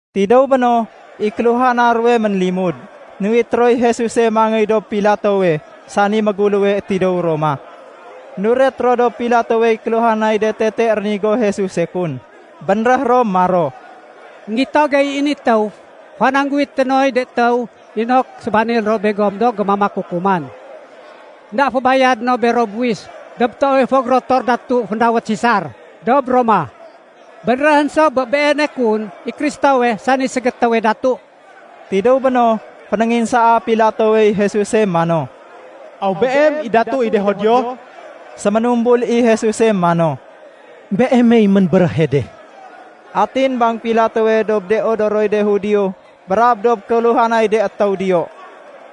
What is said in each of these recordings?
Tidéw béno, i kéluhana ruwe ménlimud, nuwit roy Jesuse mangéy dob Pilatowe sani méguléwe tidéw Roma. Nuret ro dob Pilatowey kéluhanay de tete rénigo Jesuse kun. Bénréh ro maro, “Enggito gey i ni étéw fanangguwité noy de étéw inok sébanil ro begom do gémamak kukuman. Enda fébayade no bero buwis dob toowe fo gérotor datu féndawét Sesar dob Roma. Bénréhén so bé Beene kun i Kristowe sani ségétéwe datu.” Tidéw béno, fénénginsaa Pilatowey Jesus mano, “Aw Beem i Datu i de Judio?” Séménumbul i Jesuse mano, “Beemey ménbéréhe de.” Atin bang Pilatowe dob de odoroy de Judio brab dob kéluhanay de étéw diyo,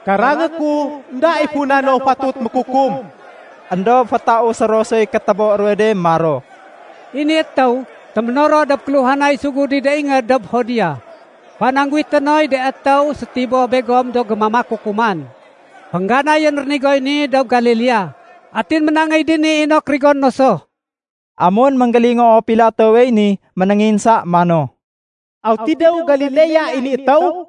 “Karangé ku, énda i funa no fatut mékukum.” Endob fétausé ro soy kétébo ruwe de maro, “I ni étéw téménoro dob kéluhanay sugud i de ingéd dob Judea fanangguwité noy de étéw sétiboh begom do gémamak kukuman. Féngganayén rénigoy ni dob Galilea, atin ménangéy dini inok rigoné no so.” Amun énggélingoo Pilatowey ni, ménénginsa mano, “Aw tidéw Galilea i ni étéw?”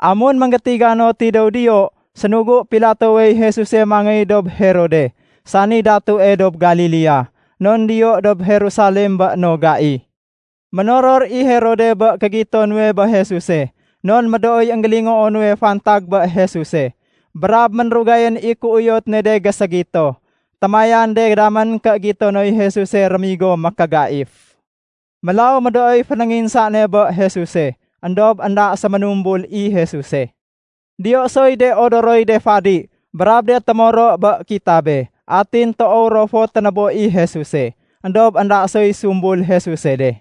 Amun énggétiga no tidéw diyo, sénugu Pilatowey Jesuse mangéy dob Herode, sani datue dob Galilea, non diyo dob Jerusalem bé no gai. Ménoror i Herode bé kégito nuwe bé Jesuse. Non médooy énggélingoo nuwe fantag bé Jesuse, brab ménrugayén i kéuyot ne de géségito. Témayan de damén ké gito noy Jesuse rémigo mékégaif. Mélaw médooy fénénginsa ne bé Jesuse. Endob énda séménumbul i Jesuse. Diyo soy de odoroy de fadi brab de témoro bé kitabe. Atin toow ro fo ténébo i Jesuse. Endob énda soy sumbul Jesuse de.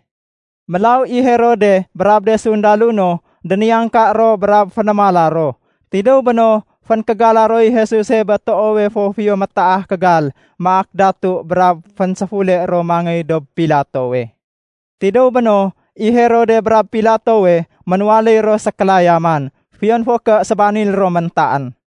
Mélaw i Herode brab de sundalo no, déniyangka ro brab fénémala ro. Tidéw béno, fénkégala roy Jesuse bé toowe fo fiyo métaah kégal maak datu brab fénséfule ro mangéy dob Pilatowe. Tidéw béno, i Herode brab Pilatowe ménwaléy ro sékélayaman, fiyon fo ké sébanil ro méntaén.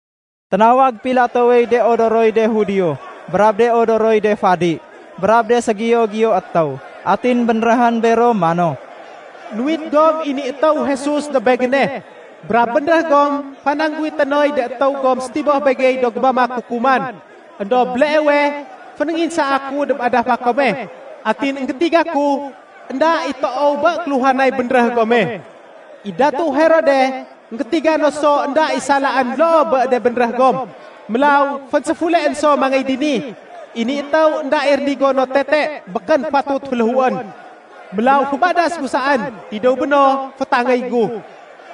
Ténawag Pilatowey de odoroy de Judio, brab de odoroy de fadi, brab de ségiyo-giyo étéw. Atin bénréhén bero mano, “Nuwit gom i ni étéw Jesus dob begéne, brab bénréh gom fanangguwité noy de étéw gom sétiboh begey do gémamak kukuman. Endob béleewe fénénginsaa ku dob adafa kome, atin énggétiga ku énda i toow bé kéluhanay bénréh gome. I datu Herode énggétiga no so énda i salaén loo bé de bénréh gom, mélaw fénséfuleén so mangéy dini. I ni étéw énda i rénigo no tete. Békén fatut féléhuén. Mélaw fébadas gu saén, tidéw béno fétangéy gu.”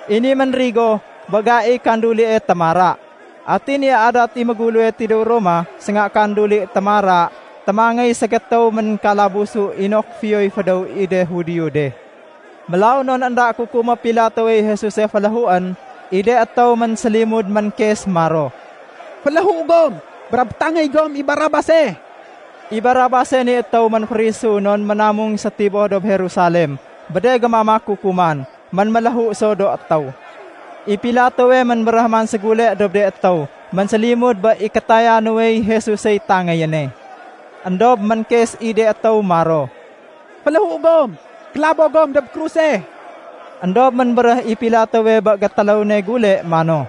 I ni ménrigo bé gaiy kékandulie “Témara”. Atin i adat i méguléwe tidéw Roma sénga kanduli “Témara” témangéy ségétéw ménkalabusu inok fiyoy fédéw i de Judio de. Mélaw non énda kukumé Pilatowey Jesuse féléhuén, i de étéw ménsélimud ménkes maro, “Féléhu gom, brab tangéy gom i Barabase.” (I Barabase ni étéw ménférisu non ménamung sétiboh dob Jerusalem bé de gémamak kukuman. Ménméléhu so do étéw.) I Pilatowe ménbéréh man ségule dob de étéw ménsélimud bé i kétaya nuwey Jesusey tangéyéne. Endob ménkes i de étéw maro, “Féléhu gom! Kélabo gom dob kruse!” Endob ménbéréh i Pilatowe bé gétéléw ne gule mano,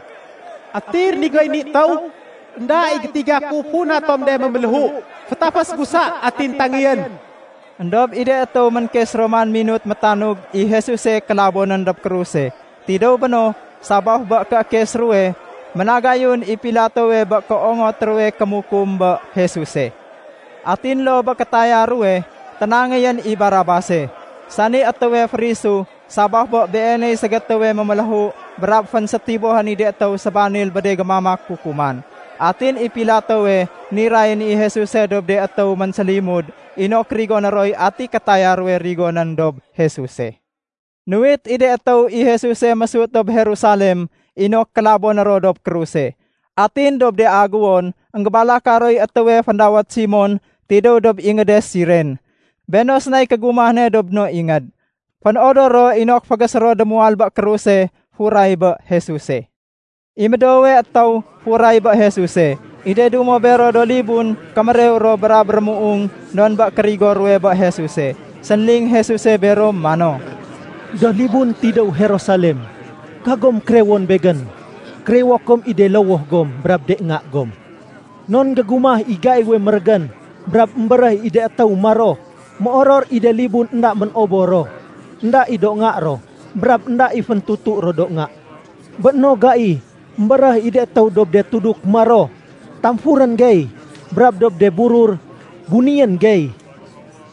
“Ati rénigoy ni étéw? Enda i gétiga ku funa tom de méméléhu. Fétafés gu sa atin tangéyén.” Endob i de étéw ménkes ro man minut métanug i Jesuse kélabonén dob kruse. Tidéw béno, sabaf bé kéékes ruwe, ménagayun i Pilatowe bé kéongot ruwe kémukum bé Jesuse. Atin loo bé kétaya ruwe, ténangéyén i Barabase, sani étéwe férisu sabaf bé beeney ségétéwe méméléhu brab fénsétibohén i de étéw sébanil bé de gémamak kukuman. Atin i Pilatowe nirayén i Jesuse dob de étéw ménsélimud inok rigoné roy ati kétaya ruwe rigonén dob Jesuse. Nuwit i de étéw i Jesuse mésut dob Jerusalem inok kélaboné ro dob kruse. Atin dob de aguwon, énggébalaka roy étéwe féndawét Simon tidéw dob ingéde Siren. Béno sénay kégumah ne dob no ingéd. Fénodor ro inok fégésé ro démuwal bé kruse furay bé Jesuse. I médoowe étéw furay bé Jesuse. I de dumo bero do libun kémérew ro brab rémuung non bé kérigo ruwe bé Jesuse. Sénling Jesuse bero mano, “Do libun tidéw Jerusalem, kagom kérewon Begén. Kérewo kom i de lowoh gom brab de nga gom. Non gégumah i gaiwe mérégén brab émbéréh i de étéw maro, ‘Méoror i de libun énda mén-obor ro, énda i do nga ro, brab énda i féntutu ro do nga.’ Bé no gai, émbéréh i de étéw dob de tuduk maro, ‘Tamfurén gey!’ brab dob de burur, ‘Bunéyén gey!’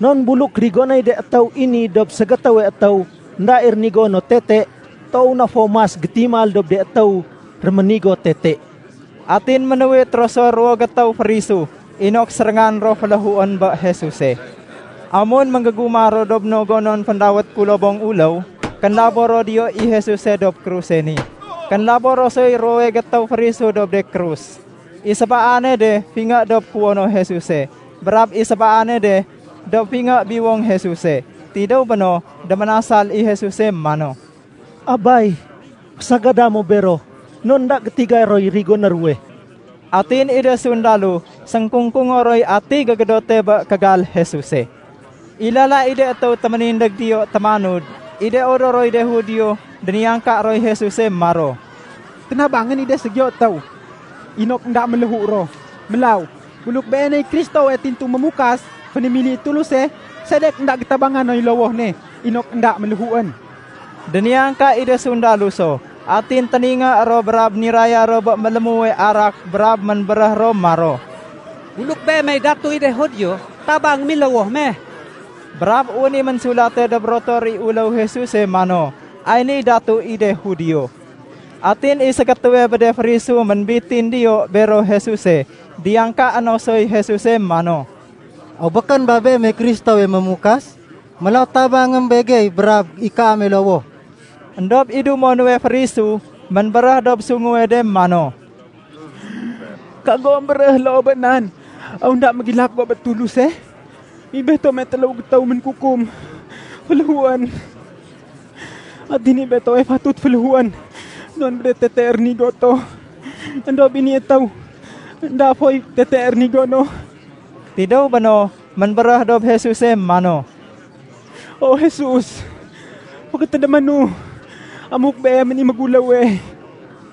Non buluk rigonéy de étéw i ni dob ségétéwe étéw énda i rénigo no tete, toow na fo mas gétimal dob de étéw réménigo tete.” Atin ménuwit ro so ruwo gétéw férisu inok séréngan ro féléhuén bé Jesuse. Amun ménggégumah ro dob no gonon féndawét “kulobong uléw”, kénlabo ro diyo i Jesuse dob kruse ni. Kénlabo ro soy ruwowe gétéw férisu dob de krus. I sébaane de fingé dob kuwono Jesuse, brab i sébaane de dob fingé biwong Jesuse. Tidéw béno, déménasal i Jesuse mano, “Abay, fésagada mo bero non énda gétiga roy rigoné ruwe.” Atin i de sundalo sénkungkungo roy ati gégédote bé kégal Jesuse. I lala i de étéw téménindég diyo témanud, i de odoroy de Judio déniyangka roy Jesuse maro, “Ténabangén i de ségiyo étéw inok énda méléhu ro. Mélaw, buluk Beeney Kristowe tintu Mémukas fénémili i Tuluse, sedek énda gétabanga noy lowoh ne inok énda méléhuén?” Déniyangka i de sundalo so. Atin téningé ro brab niraya ro bé mélémuwe arak brab ménbéréh ro maro, “Buluk Beemey datu i de Judio, tabangém i lowoh me.” Brab wén i ménsulate dob rotor i uléw Jesuse mano, “Ay niy datu i de Judio.” Atin i ségétéwe bé de férisu ménbitin diyo bero Jesuse, diyangkaé no soy Jesuse mano, “Aw békén ba Beemey Kristowe Mémukas? Mélaw tabangém begey brab i kaame lowoh.” Endob i dumo nuwe férisu ménbéréh dob sunguwe de mano, “Kago émbéréh loo bé nan! Aw énda mégilak go bé Tuluse? I betome téléw gétéw ménkukum féléhuén. Atin i betowe fatut féléhuén non bé de tete rénigo to. Endob i ni étéw énda foy tete rénigo no.” Tidéw béno, ménbéréh dob Jesuse mano, “O Jesus, fégétédéménu amuk Beemén i méguléwe.”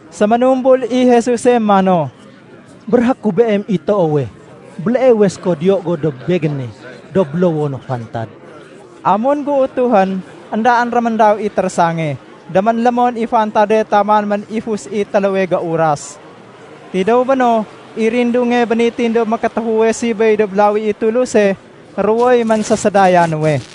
Séménumbul i Jesuse mano, “Béréhé ku beem i toowe, béleewe séko diyo go dob Begéne dob bélowono fantad.” Amun géutuhén, éndaén réméndaw i térésange. Déménlémon i fantade taman ménifus i téléwe géuras. Tidéw béno, i rindunge bénitin dob mékétéfuwe sibéy dob lawi i Tuluse, ruwoy ménsésédaya nuwe.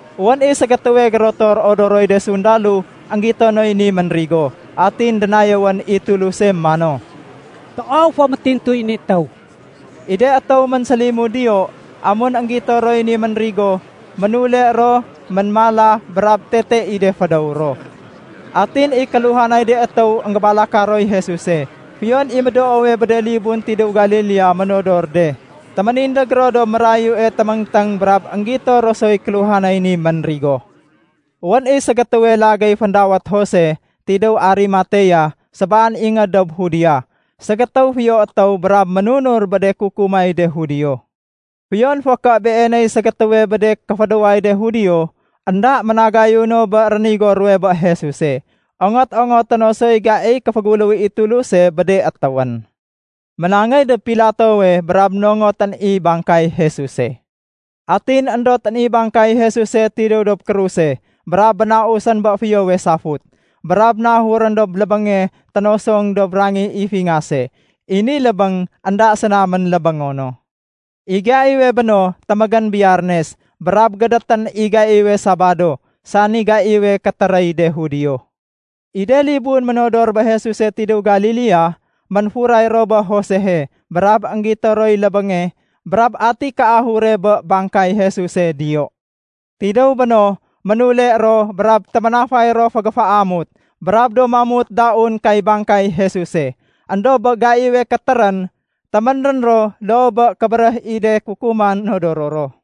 Wén i ségétéwe gérotor odoroy de sundalo énggito noy ni ménrigo, atin dénayéwén i Tuluse mano, “Toow fo métintuy ni étéw!” I de étéw ménsélimud diyo, amun énggito roy ni ménrigo, ménule ro ménmala brab tete i de fédéw ro. Atin i kéluhanay de étéw énggébalaka roy Jesuse, fiyon i médoowe bé de libun tidéw Galilea ménodor de, téménindég ro dob mérayue téméngténg brab énggito ro soy kéluhanay ni ménrigo. Wén i ségétéwe lagéy féndawét Jose tidéw Arimatea sébaan ingéd dob Judea. Ségétéw fiyo étéw brab ménunur bé de kukumay de Judio. Fiyon fo ké beeney ségétéwe bé de kéfédéway de Judio, énda ménagayu no bé rénigo ruwe bé Jesuse. Ongot-ongoté no soy gaiy kéféguléw i Tuluse bé de étéwén. Ménangéy dob Pilatowe brab nongotén i bangkay Jesuse. Atin éndotén i bangkay Jesuse tidéw dob kruse brab bénausén bé fiyowe safut, brab nahurén dob lébénge ténosong dob rangih i fingase. I ni lébéng énda séna ménlébéngo no. I gaiwe béno témégén Biyarnes brab gédétén i gaiwe Sabado sani gaiwe kétéréy de Judio. I de libun ménodor bé Jesuse tidéw Galilea, ménfuray ro bé Josehe brab énggito roy lébénge brab ati kéahure bé bangkay Jesuse diyo. Tidéw béno, ménule ro brab téménafay ro fégéféamut brab do mamut daun kay bangkay Jesuse. Endob bé gaiwe kétérén, téménrén ro loo bé kébéréh i de kukuman nodoro ro.